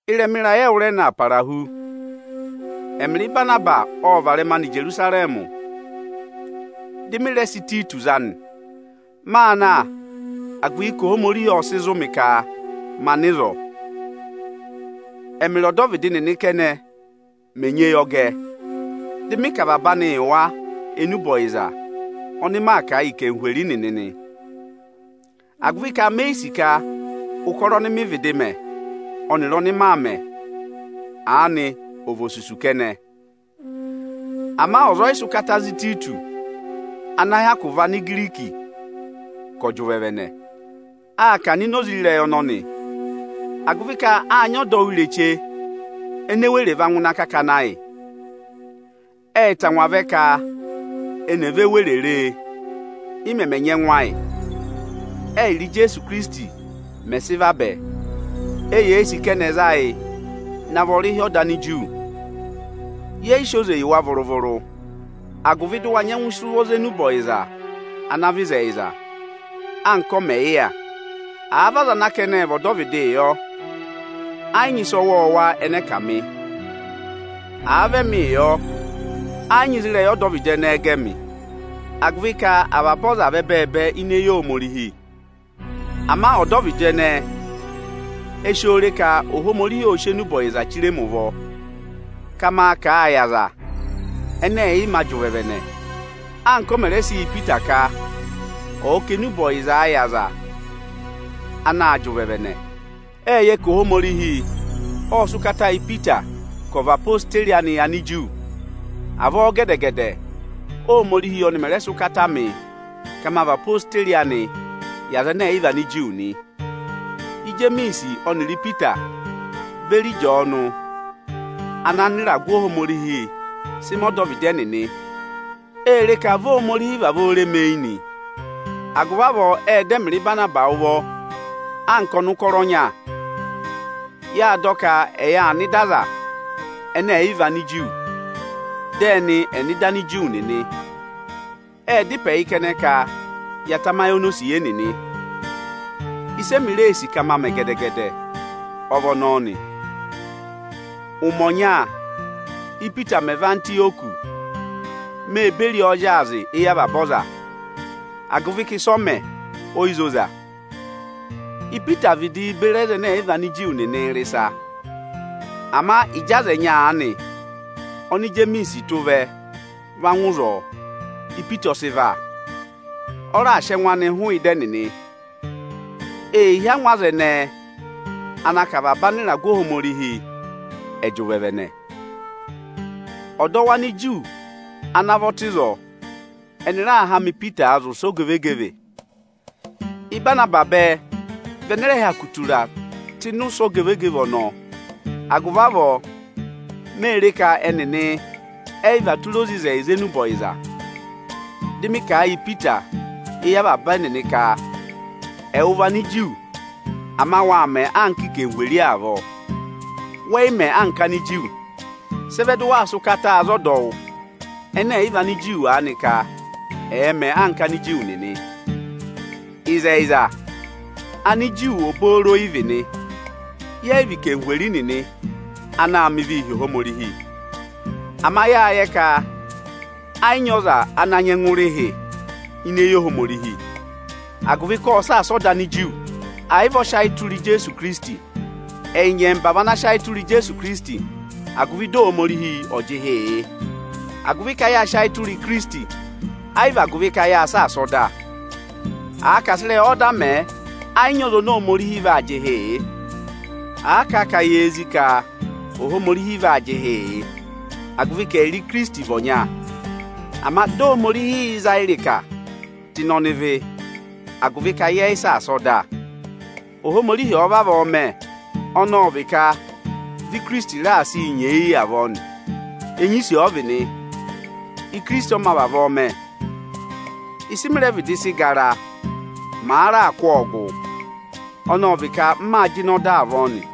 Ịrẹma ịrayị ẹwụrẹna para hu, ẹmịrị Ịbanabasị ọ́ọ varẹma nọ Ijerusarẹmị, dị mị rẹ sị Ịtayịtọsị za nị. Máa na, agụvị ka Ohomorihi ọ́ọ sị zụ̀ mị ka ma nọ ịzọọ. Ẹ́mịrị ọdọvịdị nịnị kẹnẹ mẹ̀ nyị eyọgẹ, dị mị kà avaba anị yị wa enube ọyịza ọnị maa kà a yị anarịmadọwụ nịnị nị. Me yi sì ka ụkọrọ ọnị mị vịdị mẹ ọnịrị ọnị maa mẹ̀ aanị ò vị osusu kẹnẹ. Ama ọza ọ yị sị ụkata za Ịtayịtọsị ana hyakụ vị Anigiriki ka ọ̀ jị ụvẹvẹnẹ. Aa kà ọ̀nọ̀ ini oze ịrẹyị ọnọnị, agụvị ka áa nyị ọdọwụ ireche nini ene were va ngụ ịnị akakana ayị. Ẹ́ẹ tangwa vẹ ka eni è ve were re ị mẹmẹ nyị ẹngụ ayị, ẹ́yịrị Ijeesu Ikirisiti mẹ̀ sị vabẹ. Eyee sì ka ẹnị ẹ̀ za yị na vị ọrịhị (ọda Aniju). Yẹ yị sị oze yị wa vụrụ-vụrụ, agụvị dị ụ wa nyẹngụ sị ụvọ za enube ọyịza ana vị ịzẹyịza anka ọ mẹ̀ yị yà. Àa vị aza ana a ka ẹ́ẹ vị ọdọvịdịị yọ, ẹ yị nyị ịsa ọwọọwa ẹnẹ ẹ kà mị. Àa vị ẹmịị yọ, ẹ yị nyị ịzị ịrẹyị ọdọvịdị ẹnẹẹ gẹ mị agụvị ka avaba ọza vị ẹbẹẹbẹ ini eyi Ohomorihi. Ama ọdọvịdị ẹnẹẹ e si oo re ka Ohomorihi ọ́ọ sị enube ọyịza chire mi ụvọ ka maa kà a yị aza ẹnẹ ẹ̀ yị mā jị ụvẹvẹnẹ, anka ọ mẹ̀ rẹ sị yị Ipita ka ọ́ọ kà enube ọyịza yị aza anaā jị ụvẹvẹnẹ. Ẹ́ẹ yẹ ka Ohomorihi ọ́ọ sị ụkata yị Ipita ka ọ̀ vị odeyi anị yị Aniju. Avọọ gẹdẹ-gẹdẹ Óhomorihii ọnị mẹ̀ rẹ sị ụkata mị ka ma vị odeyi anị yị aza ẹnẹ ẹ̀ yị vị Aniju nị. Ijemiisi ọnịrị Ipita beri Ịjọọnụ ana anịragụ Ohomorihi sị mẹ ọdọvịdị ẹnịnị, ée re ka vi Ohomorihi vavọọ re mi eyi nị. Agụvị avọọ ẹ́ẹ dọ ẹmịrị Ịbanabasị ụvọ anka ọnụkọrọ ọnya. Yâ dọ ka ẹ yà nọ ịda aza ẹnẹ ẹ̀ yị vị Aniju, dị ẹnị ẹ̀ nọ ịda Aniju nịnị. Ệ dá ịpẹ yị kẹnẹ ka ya tamayị onosiye nịnị. Ịsị emi reē sì ka ma mẹ gẹdẹ-gẹdẹ ọ vị ọnọọ nị. Ụmẹ ọnya, Ípita mẹ̀ vẹ Antịyọkị, mê beri ọọ zyaazị éyi avaba aza, agụvị ka ịsị ọ mẹ, o yi zoza. Ipita vidiī beri aza ẹnẹ ẹ̀ yị vị Aniju nịnị rị ịsa. Ama ịjị aza ẹnyị aanị oni Ijemiisi tụ́ vẹ, va ngụ ịzọọ, Ipita ọ sị và, ọ raa sị ẹngụ anị hụụ ịda ẹnịnị. Ee hí angwa aza ẹnẹẹ ana ka avaba anịragụ Ohomorihi ẹ̀ jị ụvẹvẹnẹ. Ọdọwụ Aniju ana vọ tụ́ ịzọọ, ẹnị raa hama Ipitaa zị ụsẹ ogevegeve. Ịbanabasị bẹẹ vị ẹnẹẹ rẹ hyakụ tura tụ́ ịnị ụsẹ ogevegeve ọnọọ. Agụvị avọọ, m mè re ka ẹnịnị ẹ yị và tụra oze ịzẹyịza enube ọyịza, dị mị kà a yị Ipita éyi avaba ẹnịnị ka, “Ẹwụ vị Aniju, ama waa mẹ anka anarịmadọwụ avọọ, wẹ yị mẹ anka Aniju; sị ẹ vẹ dị waa sị ụkata za ọdọwụ ẹnẹ ẹ̀ yị vị Aniju aanị ka ẹ̀ẹ mẹ anka Aniju nịnị?” Ịzẹyịza, Aniju obooro ị vị nị, yẹ yị vị anarịmadọwụ nịnị anaā mẹ ịvịị hi Ohomorihi. Ama yáa yẹ ka ẹ yị nyị ọza ana nyẹngụ rị ịhị ini eyi Ohomorihi, agụvị ka ọ́ọ saasa ọda Aniju, àyị vị ọ sị ayị tụra Ijeesu Ikirisiti. Ẹyị nyẹmba vị ana sị ayị tụra Ijeesu Ikirisiti, agụvị dị Ohomorihi ọ̀ jị ịhị yị, agụvị ka yáa sị ayị tụra Ikirisiti, ẹ yị vị agụvị ka yáa saasa ọda. Àa ka à sị ịrẹyị ọda mẹẹ, ẹ yị nyị ọza oni Ohomorihi vaa jị ịhị yị. À kà a ka yee zí ka Ohomorihi vaa jị ịhị yị, agụvị ka ẹyịrị Ikirisiti vị ọnya, ama dị Ohomorihi yị za yị ịrịka tụ́ ịnị ọnịvị (agụvị ka yẹ yị saasa ọda). Ohomorihi ọ̀ọ vavọọ mẹ, ọnị ọ vị ka vị Ikirisiti raà sị yị nyeeyi avọọ nị. Enyisi ọ vị nị, Ikirisiti ọ mā vavọọ mẹ. Ịsị mị rẹ vịdị sị gara, màa raa kụ́ ọọ gụ, ọnọọ vị ka m maa jịnẹ ọda avọọ nị.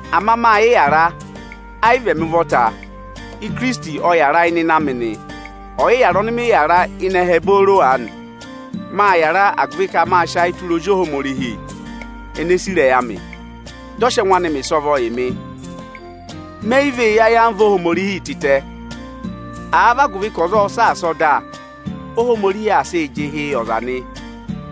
Ama ma yị yàra, ẹ yị vị ẹmị ụvọta, Ikirisiti ọ yàra ịnị ịnẹ amị nị. Ọyịyàra ọnị mị yàra ịnị ẹhẹ booro aanị, mâ yàra agụvị ka mâ sị ayị tụra Ozi Ohomorihi ene sì ịrẹyị amị, dị ọ sị ẹngụ anị mẹ̀ ịsọvọ yị mị. Me yi vee yi ayamva Ohomorihi tịtẹ. Àa vị agụvị ka ọza ọ́ọ saasa ọda, Óhomorihi aa sịị jị ịhị yị ọza nị,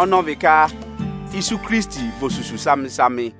ọnị ọ vị ka isu Ikirisiti vị osusu samị-samị.